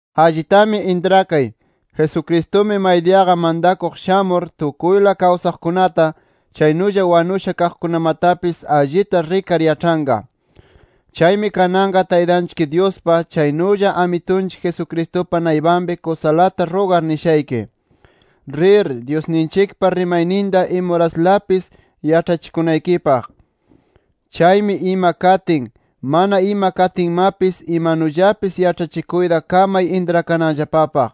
Allitami intrakay, Jesucristumi maydiyaqa mantakuq shamur tukuyla kawsaqkunata, chaynulla wanusha kaqkunamatapis allita rikar yaĉhanqa. Chaymi kananqa Taytanchik Dyuspa, chaynulla Amitunchik Jesucristupa naypanpi kusalata rugar nishayki: Rir, Dyusninchikpa rimayninta imuraslapis yaĉhachikunaykipaq. Chaymi ima katin, mana ima katinmapis imanullapis yaĉhachikuyta kamay intrakananllapapaq.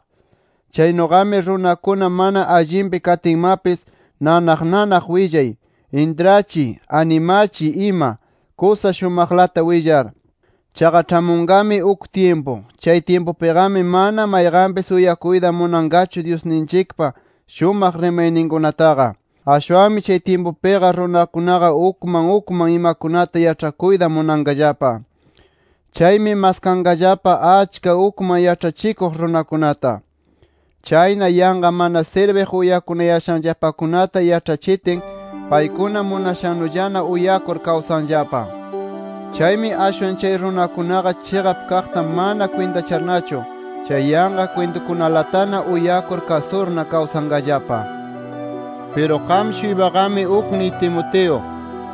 Chaynuqami runakuna mana allinpi katinmapis nanaq nanaq willay, intrachiy, animachiy ima, kusa shumaqlata willar. Chaqa ĉhamunqami uk tyimpu, chay tyimpupiqami mana mayqanpis uyakuyta munanqachu Dyusninchikpa shumaq rimayninkunataqa. Ashwanmi chay tyimpupiqa runakunaqa ukman ukman imakunata yaĉhakuyta munanqallapa. Chaymi maskanqallapa achka ukman yaĉhachikuq runakunata. Chayna yanqa mana sirbiq uyakunayashanllapakunata yaĉhachitin, paykuna munashannullana uyakur kawsanllapa. Chaymi ashwan chay runakunaqa chiqap kaqta mana kwintacharnachu, chay yanqa kwintukunalatana uyakur kasurna kawsanqallapa. Piru qam-shuypaqami ukniy Timoteo,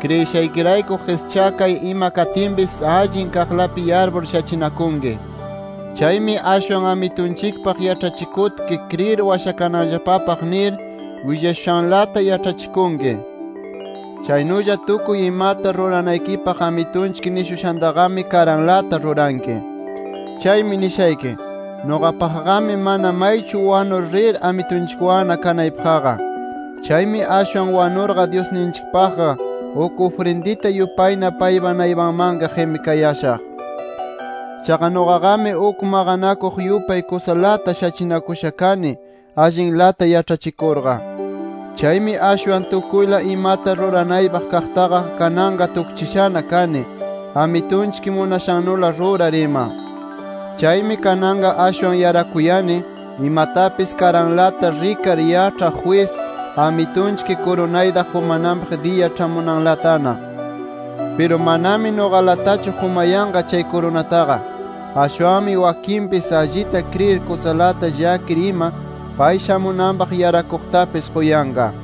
kriyishaykirayku qischakay ima katinpis allin kaqlapi yarpur shachinakunki. Chaymi ashwan Amitunchikpaq yaĉhachikutki kriyir washakananllapapaq nir willashushanlata yaĉhachikunki. Chaynulla tukuy imata ruranaykipaq Amitunchik nishushantaqami karanlata ruranki. Chaymi nishayki: Nuqapaqqami mana maychu wanur rir Amitunchikwanna kanaypaqqa. Chaymi ashwan wanurqa, Dyusninchikpaqqa uk ufrindita yupayna paypa naypanmanqa qimikayashaq. Chaqa nuqaqami uk maqanakuq yupay kusalata shachinakusha kani allinlata yaĉhachikurqa. Chaymi ashwan tukuyla imata ruranaypaq kaqtaqa kananqa tukchishana kani, Amitunchik munashannula rurar ima. Chaymi kananqa ashwan yarakuyani, imatapis karanlata rikar yaĉhaq jwis Amitunchik kurunayta qumananpaq diya ĉhamunanlatana. Piru manami nuqalatachu qumayanqa chay kurunataqa, ashwanmi wakinpis allita kriyir kusalata llakir ima pay shamunanpaq yaraqkunatapis quyanqa.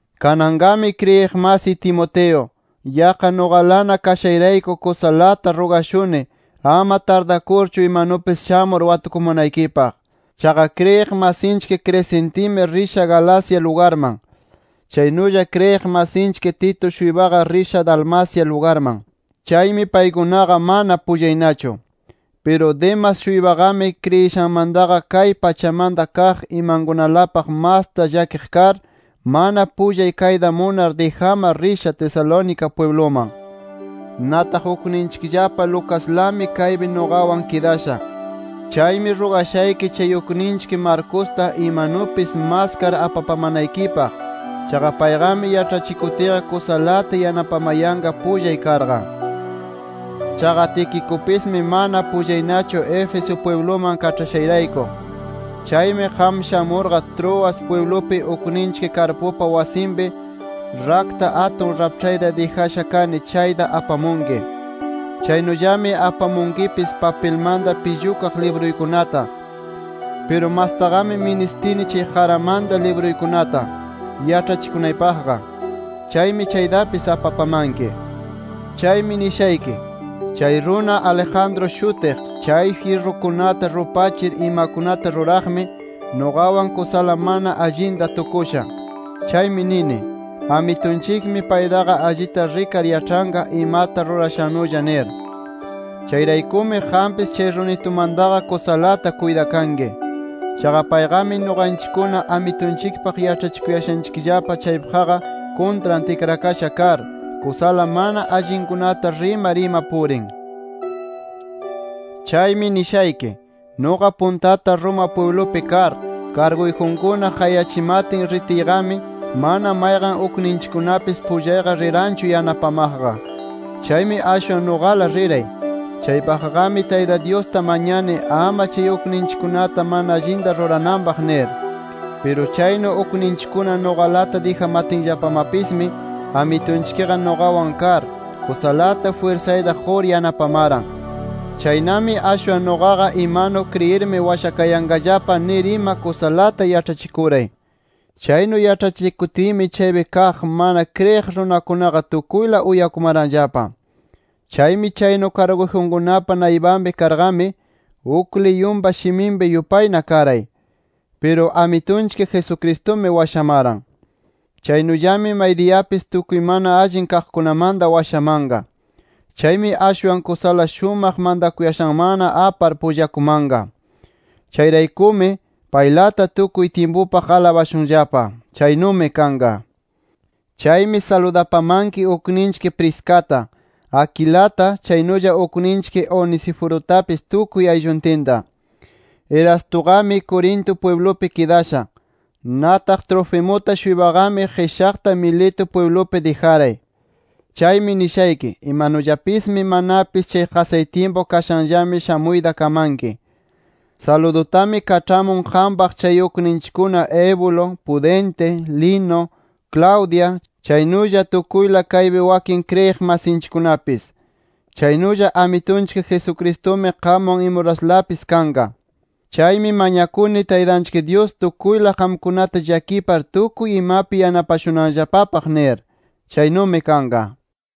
Kananqami kriyiq masiy Timoteo, yaqqa nuqalana kashayrayku kusalata rugashuni ama tardakurchu imanupis shamur watukumanaykipaq. Chaqa kriyiq masinchik Crescentimi risha Galacia lugarman. Chaynulla kriyiq masinchik Tito-shuypaqa risha Dalmacia lugarman. Chaymi paykunaqa mana pullaynachu. Piru Demas-shuypaqami kriyishanmantaqa kay pachamanta kaq imankunalapaq masta llakiq kar, mana pullay kayta munar dijamar risha Tesalónica pwibluman. Nataq ukninchikllapa Lucaslami kaypi nuqawan kidasha. Chaymi rugashayki chay ukninchik Marcosta imanupis maskar apapamanaykipaq. Chaqa payqami yaĉhachikutiyqa kusalata yanapamayanqa pullay karqa. Chaqa Tiquicupismi mana pullaynachu Éfeso pwibluman kaĉhashayrayku. Chaymi qam shamurqa, Troas pwiblupi ukninchik Carpupa wasinpi rakta atun raĉhpayta dijasha kani, chayta apamunki. Chaynullami apamunkipis papilmanta pillukaq libruykunata. Piru mastaqami ministini chay qaramanta libruykunata yaĉhachikunaypaqqa. Chaymi chaytapis apapamanki. Chaymi nishayki: Chay runa Alejandro shutiq, chay jyirrukunata rupachir imakunata ruraqmi, nuqawan kusala mana allinta tukusha. Chaymi nini: Amitunchikmi paytaqa allita rikar yaĉhanqa imata rurashannulla nir. Chayraykumi qampis chay runitumantaqa kusalata kuytakanki. Chaqa payqami nuqanchikkuna Amitunchikpaq yaĉhachikuyanchikllapa chaypaqqa kuntran tikrakasha kar, kusala mana allinkunata rimar ima purin. Chaymi nishayki: Nuqa puntata Roma pwiblupi kar, karguyjunkuna qayachimatin ritiyqami, mana mayqan ukninchikkunapis pullayqa riranchu yanapamaqqa. Chaymi ashwan nuqala riray. Chaypaqqami Tayta Dyusta mañani ama chay ukninchikkunata mana allinta rurananpaq nir. Piru chaynu ukninchikkuna nuqalata dijamatinllapamapismi, Amitunchikqa nuqawan kar, kusalata jwirsayta qur yanapamaran. Chaynami ashwan nuqaqa imanu kriyirmi washakayanqallapa nir ima kusalata yaĉhachikuray. Chaynu yaĉhachikutiymi chaypi kaq mana kriyiq runakunaqa tukuyla uyakumaranllapa. Chaymi chaynu karguyjunkunapa naypanpi karqami, uk liyunpa shiminpi yupayna karay. Piru Amitunchik Jesucristumi washamaran. Chaynullami maydiyapis tukuy mana allin kaqkunamanta washamanqa. Chaymi ashwan kusala shumaq mantakuyashanmanna apar pullakumanqa. Chayraykumi ¡paylata tukuy tyimpupaq alabashunllapa! ¡Chaynumi kanqa! Chaymi saludapamanki ukninchik Priscata, Aquilata, chaynulla ukninchik Onesiforutapis tukuy aylluntinta. Erastuqami, Corinto pwiblupi kidasha. Nataq Trofimuta-shuypaqami, qishaqta Mileto pwiblupi dijaray. Chaymi nishayki: Imanullapismi manapis chay qasay tyimpu kashanllami shamuyta kamanki. Saludutami kaĉhamun qampaq chay ukninchikkuna Eubulo, Pudente, Lino, Claudia, chaynulla tukuyla kaypi wakin kriyiq masinchikkunapis. Chaynulla Amitunchik Jesucristumi qamwan imuraslapis kanqa. Chaymi mañakuni Taytanchik Dyus tukuyla qamkunata llakipar tukuy imapi yanapashunanllapapaq nir. Chaynumi kanqa.